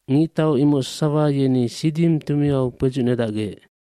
Ngictau imoc sasawa yeni Siddima tumiau kpedzucnedacgec.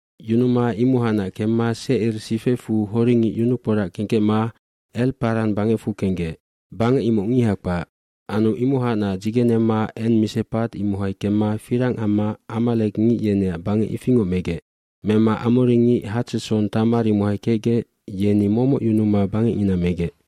Yunuma imohacnac kemma Secir sifecfuc horingic yunukporac kengkecma El Paran bangecfu kenggec. Bangec imoc ngiha kpac. Anu imohacnac dzigenema En Misepatd imohai kemma firang amma amalekngic yeneac bangec ifingoc megec. Mema amoringic Hatsetson Tamar imohai kecgec yeni momoc yunuma bangecngina megec.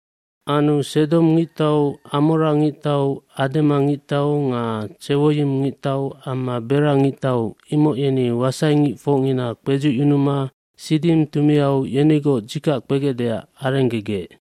Anu Sedom ngictau, Amora ngictau, Adema ngictau, nga Tsewoyim ngictau amma Belae ngictau imoc yeni wasaingicfocngina kpedzucyunuma Siddim tumiau yenigoc dzikac kpegecdeac arenggegec.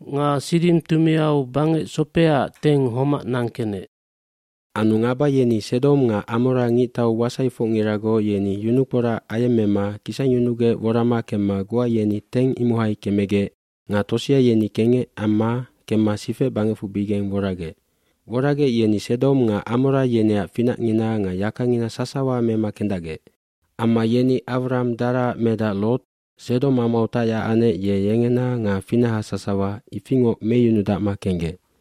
Nga Siddim tumiau bangecsopeaacf teng homac nangkenec. Anu ngaba yeni Sedom nga Amora ngictau wasaifocngiragoc yeni yunukporac ayemmema kisangyunugec worama kemma goa yeni teng imohai kemegec nga tosea yeni kengec amma kemma sifecbangecfubigeng woragec. Woragec yeni Sedom nga Amora yeneac finacngina nga yakangina sasawa mema kendacgec. Amma yeni Awram daraac medac Lot Sedom amau tacyac anec ye yengena nga finaha sasawa ifingoc meyunudacma kenggec.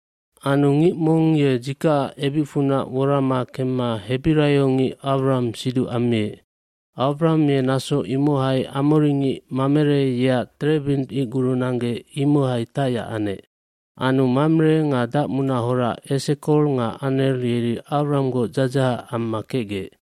Anu ngic mong ye dzikacac ebicfunac worama kemma hebiraiongic Awram siduc ammiec. Awram ye naso imohai amoringic Mamere yeac terebint icguru nanggec imohai tacyac anec. Anu Mamere nga dacmunahora Esekol nga Aner yeri Awramgoc dzadzahac amma kecgec.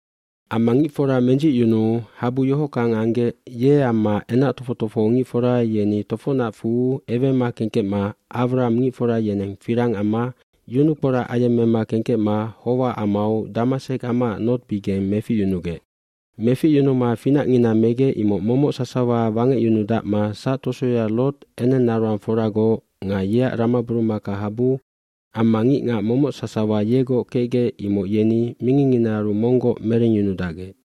Amma ngicfora mendzicyunuu habu yohockang anggec ye amma enac tofoc tofohongicfora yeni tofocnau ewema kengkecma Awram ngicfora yeneng firang amma yunukporac ayemmema kengkecma Howa amau Damasek amaac nortbigeng meficyunugec. Meficyunuma finacngina megec imoc momoc sasawa wangecyunudacma sactosoya Lot enengnaroangforagoc nga yeac ramaburumakahabu amma ngicngac momoc sasawa yegoc kecgec imoc yeni mingingnginaaru monggoc merengyunudacgec.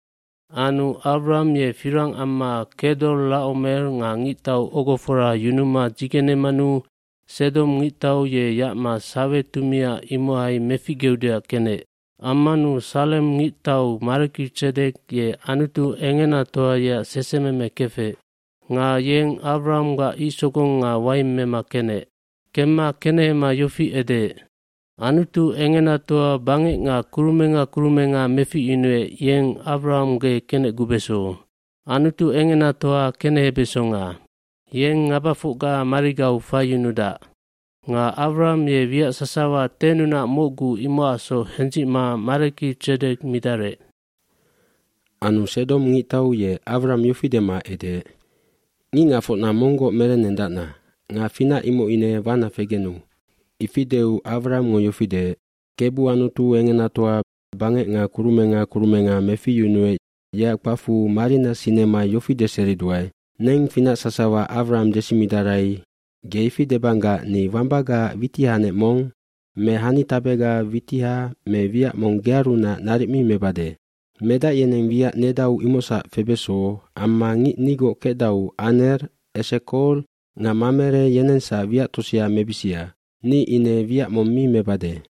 Anu Awram ye firang amma Kedor Lacomer nga ngictau ogofora yunuma dzigenemanu Sedom ngictau ye yacma Sawe tumiag imohai meficgeudeac kenec. hAmmanu Salem ngictau Maleki Tsedek ye Anutu Engenatoa yeac sesememe kefec. Nga yeng Awranggac icsogong nga waing mema kenec. iKemma kenehema yofi edeec, “Anutu Engenatoa bangec nga kurumenga kurumenga meficyunuec yeng Awram ge kenecgubeso. jAnutu Engenatoa kenehebesonga. Yeng ngabafocga marigau faiyunudac.” Nga Awram ye wiac sasawa tennunac mocgu imocacsoc hendzicma Maleki Tsedek midarec. Anu Sedom ngictau ye Awram yofi dema edeec, “Ngicngacfocna monggoc merennendacna nga finac imoc ine wana fegenu.” kIfi deu Awramngo yofi deec, “kebu Anutu Engenatoa, bangec nga kurumenga kurumenga meficyunuec yeac kpacfu marina sinema yofi deseriduae. ‘Neng finac sasawa Awram desimidarai.’ ge ifidebanggac ni wambagaac witihanec mong me hanitabe witiha mewiac mong gearunac naric mi mebade. Medac yeneng wiac nedauimocsac febeso amma ngic nigoc kecdau Aner, Esekol nga Mamereyenengsac wiac tosea mebisia. Ni ine wiac mong mi mebade.”